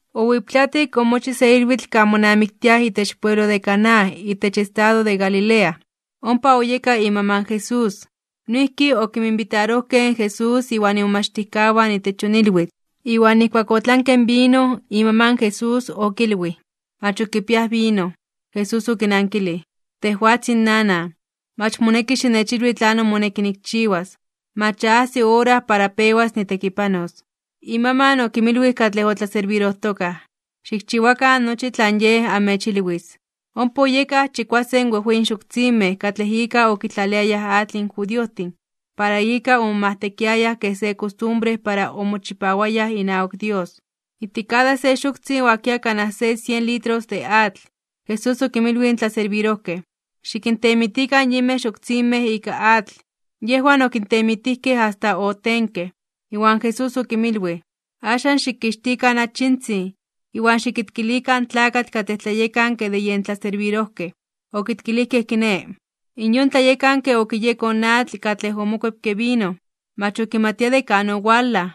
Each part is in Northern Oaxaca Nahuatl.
Owiptlatik, omochij se ilwitl kan monamiktiaj itech pueblo de Caná itech estado de Galilea. Ompa oyeka imaman in Jesús. Noijki okinminbitarojkej in Jesús iwan imomachtijkawan itech yon ilwitl. Iwan nijkuak otlanke in vino, imaman in Jesús okilwij: ―Mach ok kipiaj vino. Jesús okinankilij: ―Tejwatzin nanan, mach moneki xinechilwi tlanon moneki nikchiwas. Mach ya ajsi ora para pewas nitekipanos. Imaman okinmilwij katlej otlaserbirojtokaj: ―Xikchiwakan nochi tlan Yej amechilwis. Ompa oyekaj chikuasen wejweyin xoktzinmej katlej ika okitlaliayaj atl in judiojtin, para ika omomajtekiayaj kej se kostumbre para omochipawayaj inawak Dios. Ijtik kada se xoktzin oakia kanaj se sien litros de atl. Jesús okinmilwij in tlaserbirojkej: ―Xikintemitikan yinmej xoktzinmej ika atl. Yejwan okintemitijkej asta otenkej. Iwan Jesús okinmilwij: ―Axan xikixtikan achitzin, iwan xikitkilikan in tlakatl katlej tlayekanke de yen tlaserbirojkej. Okitkilijkej kiné. In yon tlayekanke okiyekoj in atl katlej omokuepke vino, mach okimatia de kan owalaj,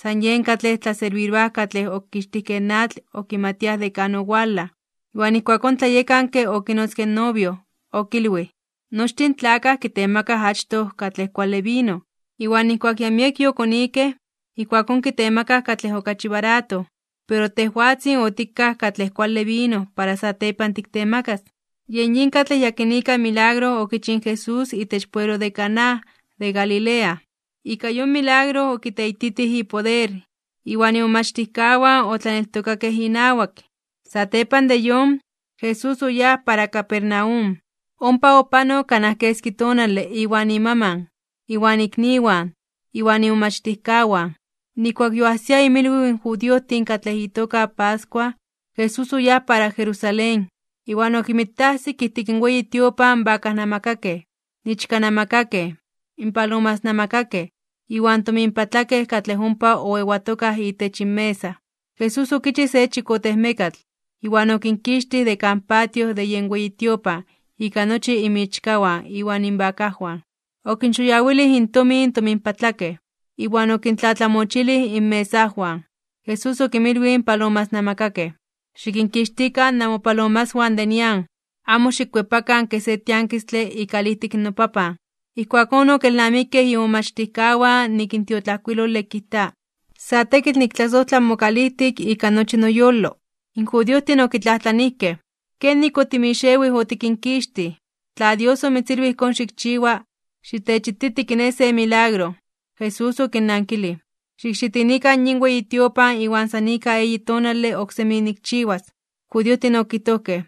san yen katlej tlaserbiroaj katlej okixtijkej atl okimatiaj de kan owalaj. Iwan ijkuakón in tlayekanke okinotzke in novio. Okilwij: ―Nochtin in tlakaj kitemaka achtoj katlej kuale vino, iwan nijkuak ya miek yokonikej, ijkuakón kitemakaj katlej okachi barato. Pero tejwatzin otikaj katlej kuale vino para satepan tiktemakas. Yen yin katlej yakinika milagro okichij in Jesús itech pueblo de Caná de Galilea. Ika yon milagro okiteititij ipoder. Iwan imomachtijkawan otlaneltokakej inawak. Satepan de yon, Jesús oyáj para Capernaum, ompa opanok kanaj keski tonale iwan imaman, iwan ikniwan, iwan imomachtijkawan. Nijkuak yoajsia inmilwiw in judiojtin katlej itoka pascua, Jesús oyáj para Jerusalén. Iwan okinmitajsik ijtik in weyi tiopan in bakajnamakakej, in ichkanamakakej, in palomasnamakakej, iwan in tominpatlakej katlej ompa oewatokaj itech inmesa. Jesús okichij se chikotejmekatl, iwan okinkixtij de kan patio de yen weyi tiopan ika nochi inmichkawan iwan inbakajwan. Okinxoyawilij intomin in tominpatlakej, iwan okintlatlamochilij inmesajwan. Jesús okinmilwij in palomasnamakakej: ―Xikinkixtikan namopalomaswan de nian. Amo xikkuepakan kej se tiankistle ikalijtik in noPapan. Ijkuakón okelnamikej imomachtijkawan nik in tiotlajkuilole kijta: “Sa tekitl niktlasojtla mokalijtik ika nochi noyolo.” In judiojtin okitlajtlanijkej: ―¿Kenik otimixewij otikinkixtij? Tla Dios omitzilwij ijkón xikchiwa, xitechititi kiné se milagro. Jesús okinnankilij: ―Xikxitinikan yin weyi tiopan iwan san ika eyi tonale oksemi nikchiwas. In judiojtin okijtojkej: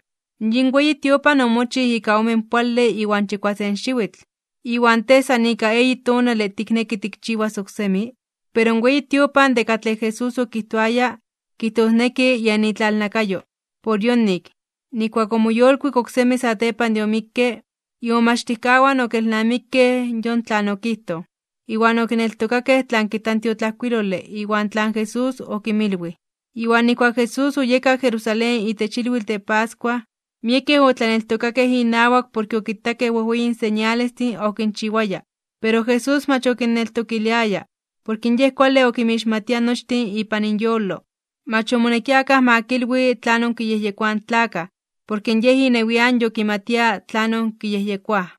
―Yin weyi tiopan omochij ika omenpoale iwan chikuasen xiwitl. ¿Iwan Tej san ika eyi tonale tikneki tikchiwas oksemi? Pero in weyi tiopan de katlej Jesús okijtoaya, kijtosneki yen itlalnakayo. Por yonik, nijkuak omoyolkuik oksemi satepan de omikke, imomachtijkawan okelnamikej yon tlan okijtoj, iwan okineltokakej tlan kijta in tiotlajkuilole iwan tlan Jesús okinmilwij. Iwan nijkuak Jesús oyeka Jerusalén itech ilwitl de pascua, miekej otlaneltokakej inawak porke okitakej wejweyin señalestin okinchiwaya. Pero Jesús mach okinneltokiliaya, porke Yej kuale okinmixmatia nochtin ipan inyolo. Mach omonekia akaj ma kilwi tlanon kiyejyekoaj in tlakaj, porke Yej inewian yokimatia tlanon kiyejyekoaj.